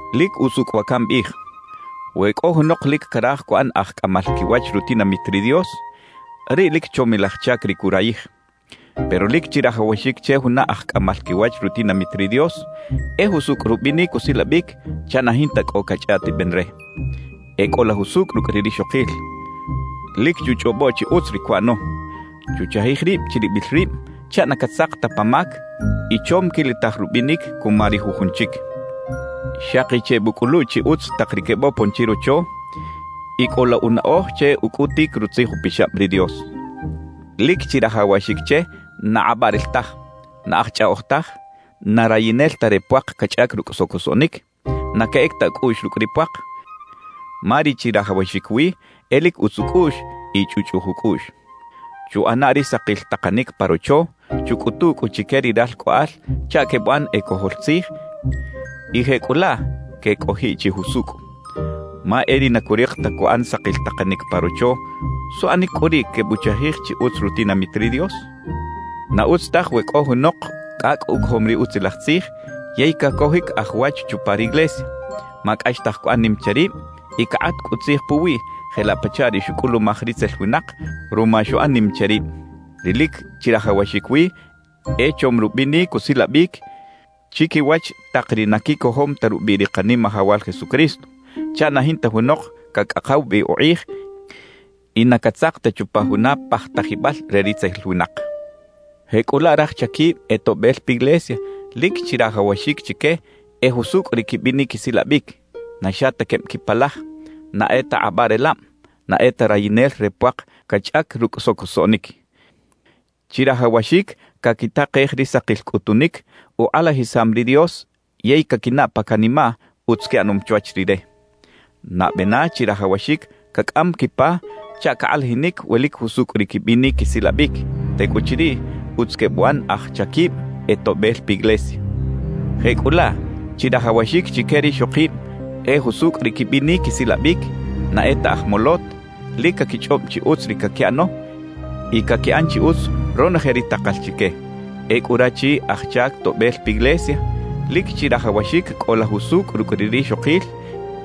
Lic usucꞌ wa cambiꞌij: We cꞌo junok lic caraj cuꞌan aj cꞌamal quiwach rutinamit ri Dios, riꞌ lic chomilaj chac ri curayij. Pero lic chirajawaxic che juna aj cꞌamal quiwach rutinamit ri Dios e jusucꞌ rubinic usilabic chaꞌ na jinta cꞌo cachꞌaꞌtiben re. E cꞌola jusucꞌ rucꞌ ri rixokil, lic chuchꞌobo chi utz ri cuꞌano, chuchajij rib chiribil rib chaꞌ na catzak ta pa mac y chom quilitaj rubinic cuma ri jujun chic. Xaki chebucꞌulu chi utz tak ri quebopon chirocho, y cꞌola unaꞌoj che ucꞌutic Rutzij Upixab ri Dios. Lic chirajawaxic che na kꞌabaꞌrel taj, na aj chꞌaꞌoj taj, na rayinel ta re puak cachꞌac rucꞌ socosoꞌnic, na queꞌec ta ucꞌuꞌx rucꞌ ri puak; ma ri chirajawaxic wi e lic utz ucꞌuꞌx y chꞌuꞌchꞌuj ucꞌuꞌx. Chuꞌana ri sakil takanic pa rocho; chucꞌutu cꞌu chique ri ralcꞌoꞌal chaꞌ quebuꞌan e cojol tzij y jecꞌulaꞌ quecꞌojiꞌ chi jusucꞌ. Ma e ri na curik ta cuꞌan sakil takanic pa rocho, ¿suꞌanic cꞌu riꞌ quebuchajij chi utz rutinamit ri Dios? Na utz taj we cꞌo junok cꞌacꞌ ucojom ri Utzilaj Tzij yey cacojic aj wach chupa riglesia, ma cꞌaxtaj cuꞌan nim che rib y cakꞌat cꞌu tzij puwiꞌ jelaꞌ pachaꞌ ri xucꞌulumaj ritzel winak ruma xuꞌan nim che rib. Ri lic chirajawaxic wi e chom rubinic usilabic chiquiwach tak ri na quicojom ta rubiꞌ ri Kanimajawal Jesucristo, chaꞌ na jinta junok cacꞌakaw bi ukꞌij y na catzak ta chupa juna pajtajibal re ritzel winak. Jecꞌulaꞌ raj chaquib e toꞌbel piglesia lic chirajawaxic chique e jusucꞌ ri quibinic quisilabic, na xa ta queb quipalaj, na e ta kꞌabaꞌrelab, na e ta rayinel re puak cachꞌac rucꞌ socosoꞌnic. Chirajawaxic caquitakej ri sakil cꞌutunic ukꞌalajisam ri Dios yey caquinaꞌ pa canimaꞌ utz quiꞌanom chwach Rire. Nabe na chirajawaxic cacꞌam quipa chaꞌ cakꞌalajinic we lic jusucꞌ ri quibinic quisilabic; tecꞌuchiriꞌ utz quebuꞌan aj chaquib e toꞌbel piglesia. Jecꞌulaꞌ, chirajawaxic chique rixokib e jusucꞌ ri quibinic quisilabic, na e ta aj molot, lic caquichꞌob chi utz ri caquiꞌano y caquiꞌan chi utz ronoje ri takal chique. Ecꞌu rachi aj chac toꞌbel piglesia, lic chirajawaxic cꞌola jusucꞌ rucꞌ ri rixokil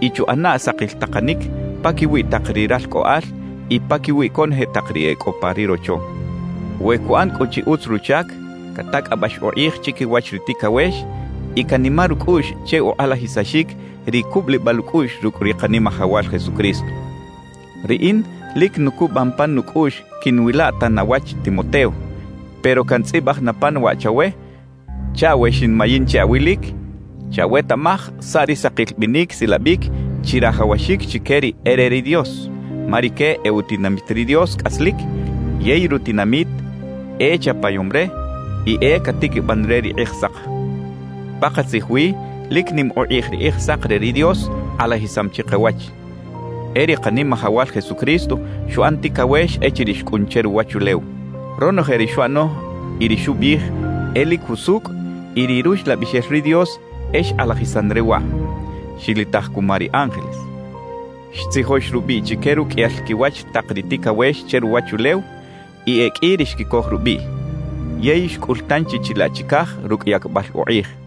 y chuꞌana sakil takanic paquiwi tak ri ralcꞌoꞌal y paquiwi conoje tak ri e cꞌo pa ri rocho. We cuꞌan cꞌu chi utz ruchac, catacꞌabax ukꞌij chiquiwach ri ticawex y canimar ucꞌuꞌx che ukꞌalajisaxic ri cubulibal ucꞌuꞌx rucꞌ ri Kanimajawal Jesucristo. Riꞌin lic nucubam pan nucꞌuꞌx quiꞌnwila tan awach Timoteo, pero cantzꞌibaj na pan waꞌ chawe chaꞌ we xinmayin che awilic, chawetaꞌmaj saꞌ ri sakil binic silabic chirajawaxic chique ri e re ri Dios; ma rique e utinamit ri Dios cꞌaslic yey rutinamit e chapayom re y e catiquiban re ri Kꞌijsak. Pakatzij wi lic nim ukꞌij ri Kꞌijsak re ri Dios kꞌalajisam chikawach: E ri Kanimajawal Jesucristo xuꞌan ticawex echiriꞌ xcꞌun che ruwachulew. Ronoje ri xuꞌano y ri xubiꞌij e lic jusucꞌ y ri Ruxlabixel ri Dios e xkꞌalajisan re waꞌ. Xilitaj cuma ri ángeles. Xtzijox rubiꞌ chique ruqꞌuiyal quiwach tak ri ticawex che ruwachulew y e qꞌui ri xquicoj rubiꞌ. Yey xcꞌul tanchi chilaꞌ chicaj rucꞌ yacbal ukꞌij.